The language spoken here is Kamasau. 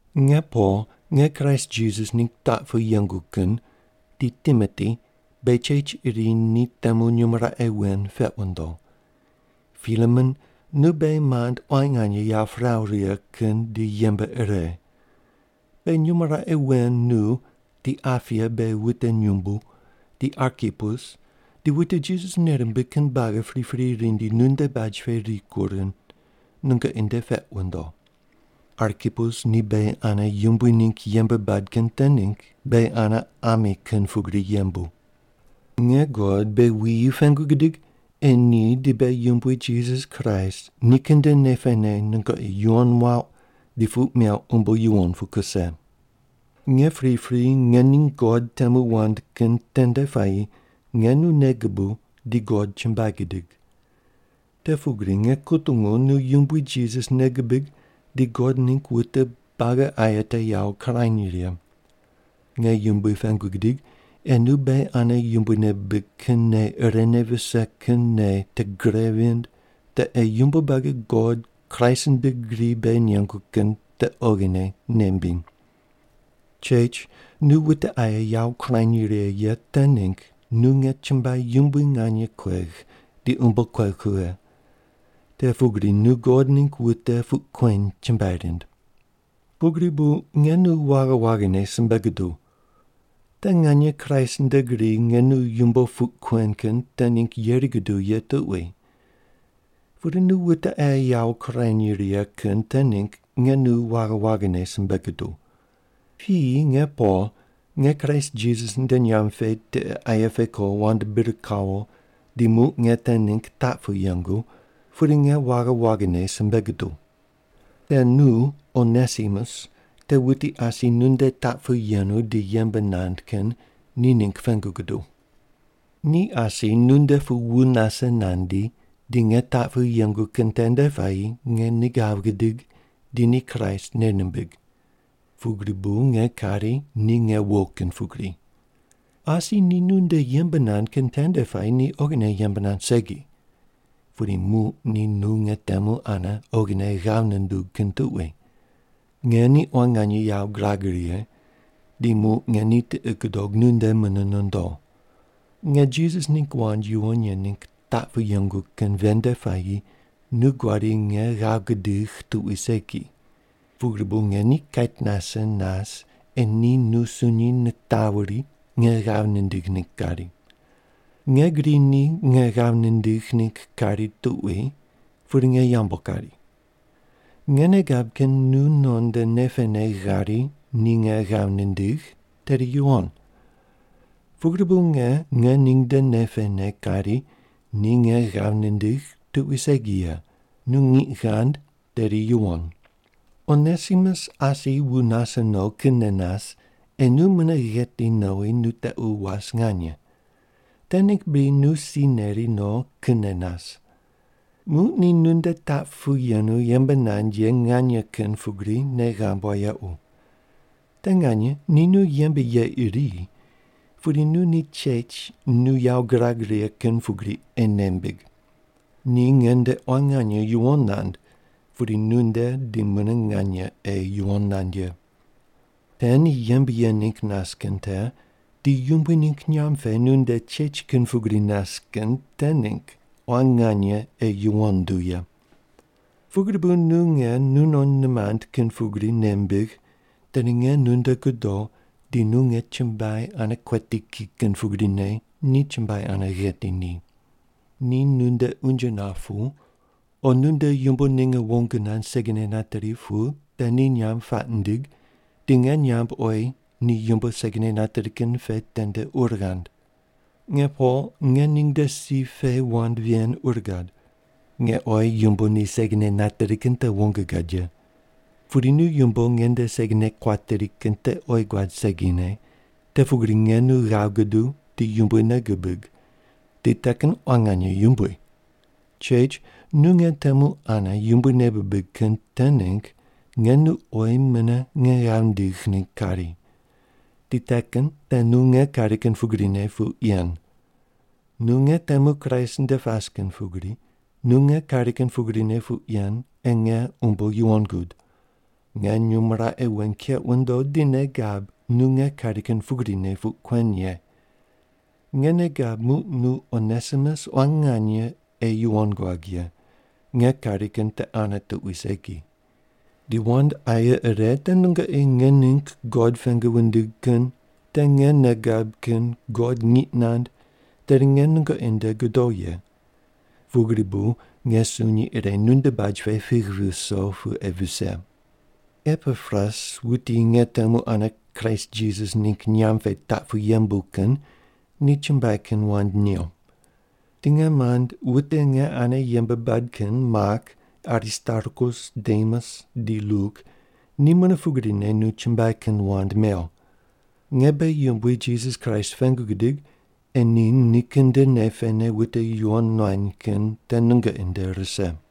Nge Pol, nge Kraist Jisas ningg taq pu yengu kin, di Timoti beghi chech iri ni temu nyumo raqe wen peq wundo. Pilemon nu beghi mand quan nganye yawo piraw righe kin di yembe ire. Beghi nyumo raqe wen nu, di Apia beghi wute nyumbu, di Arkipus, di wute Jisas nei rimbig kin buagi pripri rindi nunde baj pe rikur kin nungoqi nde peq wundo. Arkipus ni beghi ane Yumbui ningg yembe bad kin te ningg beghi ane ami kin pugri yembu. Nge God beghi wuyi pengu gidig ei ni di beghi Yumbui Jisas Kraist nikin nde nei pene nungoqi yuwon muauq di puq meuq umbo yuwon pu kuse. Nge pripri nge ning God temu wand kin tende puayi nge nu nei gubuw di God chumbuai gidig. Te pugri nge kutungu nu Yumbui Jisas nei gubig di God ningg wute buagi aye te yawo kurany righe. Nge Yumbui pengu gidig ei nu beghi ane Yumbui nei bibig kin nei irene vise kin nei te gre vind te ei yumbo buagi God Kraist nde gri beghi nengu kin te oghine nei mbiny. Chech, nu wute aye yawo kurany righe ye te ningg nu nge chumbuai yumbui nganye kuegh di umbo kuegh kughe. Te pugri nu God ningg wute puq kueny chumbuai rind. Pugri bu nge nu waghi waghine simbe guduw. Te nganye Kraist nde gri nge nu yumbo puq kuen kin te ningg yeri guduw ye tuqui. Pudi nu wute aye yawo kurany righe kin te ningg nge nu waghi waghine simbe guduw. Piyi nge Pol, nge Kraist Jisas nde nyamb pe tiqe aye pe ko wand bir kawo di muq nge te ningg taq pu yengu, pudi nge waghi waghine simbe guduw. Nge nu Onesimus te wuti asi nunde taq pu yenu di yembe nand kin ni ningg pengu guduw. Ni asi nunde pu wu nase nandi di nge taq pu yengu kin tende puayi nge ni ghav gidig di ni Kraist nei nimbig. Pugri bu nge kari ni nge wo kin pugri. Asi ni nunde yembe nand kin tende puayi ni oghine yembe nand segi. Pudi muq ni nu nge temu ane oghine ghav nundug kin tuqui. Nge ni quan nganye yawo girag righe di muq nge ni tiqi gudog nunde mune nondo. Nge Jisas ningg wand yuwon ye ningg taq pu yengu kin ven nde puayi nu guadi nge ghav gudigh tuqui segi. Pugri bu nge ni kait nase nas ei ni nu sunyi nitawuri nge ghav nindigh ningg kari. Nge gri ni nge ghav nindigh ningg kari tuqui pudi nge yambu kari. Nge nei gab kin nu non nde nei pene ghari ni nge ghav nindigh tedi yuwon. Pugri bu nge nge ning nde nei pene kari ni nge ghav nindigh tuqui segi ye, nu ngiq ghand tedi yuwon. Onesimus asi wu nase no kinne nas ei nu mune gheti nowi nu tequ was nganye. Te ningg bri nu si neri no kinne nas. Muq ni nunde taq pu yenu yembe nand ye nganye kin pugri nei ghamb wayequ. Te nganye ni nu yembe ye iri, pudi nu ni chech nu yawo gurag righe kin pugri ei nei mbig. Ni nge nde quan nganye yuwon nand pudi nu nde di mune nganye ei yuwon nand ye. Te ni yembe ye ningg nas kin te di Yumbui ningg nyamb pe nunde chech kin pugri nas kin te ningg quan nganye ei yuwon nduw ye. Pugri bu nu nge nu non nimand kin pugri nei mbigh tedi nge nunde godo di nu nge chumbuai ane kueti ki kin pugrine ni chumbuai ane gheti ni. Ni nunde unje nap pu, o nu nde yumbo ninge wong nand segine nateri pu te ni nyamb puaq ndig di nge nyamb oyi ni yumbo segine nateri kin pe tende ur ghand. Nge Pol, nge ning nde si pe wand ven ur gad. Nge oyi yumbo ni segine nateri kin te wong gad ye. Pudi nu yumbo nge nde segine kuateri kin te oyi guad segine, te pugri nge nu ghav guduw di Yumbui nei gubig, di te kin quan nganye yumbui. Chech, nu nge temu ane Yumbui nei bibig kin te ningg nge nu oyi mune nge ghav ndigh ningg kari. Di te kin te nu nge kari kin pugrine puq yen. Nu nge temu Kraist nde pas kin pugri, nu nge kari kin pugrine puq yen ei nge umbo yuwon gud. Nge nyumo raqe wen keq wundo di nei gab nu nge kari kin pugrine puq kuen ye. Nge nei gab muq nu Onesimus quan nganye ei yuwon guag ye, nge kari kin te ane tuqui segi. Di wand aye ire te nungoqi nge ningg God pengu wundig kin te nge nei gab kin God ngiq nand tedi nge nungoqi nde godo ye. Pugri bu nge sunyi ire nunde baj pe pigh viso pu ei vise. Epapras, wuti nge temu ane Kraist Jisas ningg nyamb pe taq pu yembu kin, nu chumbuai kin wand new. Di nge mand wute nge ane yembe bad kin Mak, Aristarkus, Demas di Luk ni mune pugrine nu chumbuai kin wand mew. Nge beghi Yumbui Jisas Kraist pengu gidig ei ni nikin nde nei pene wute yuwon nuany kin te nungoqi nde rise.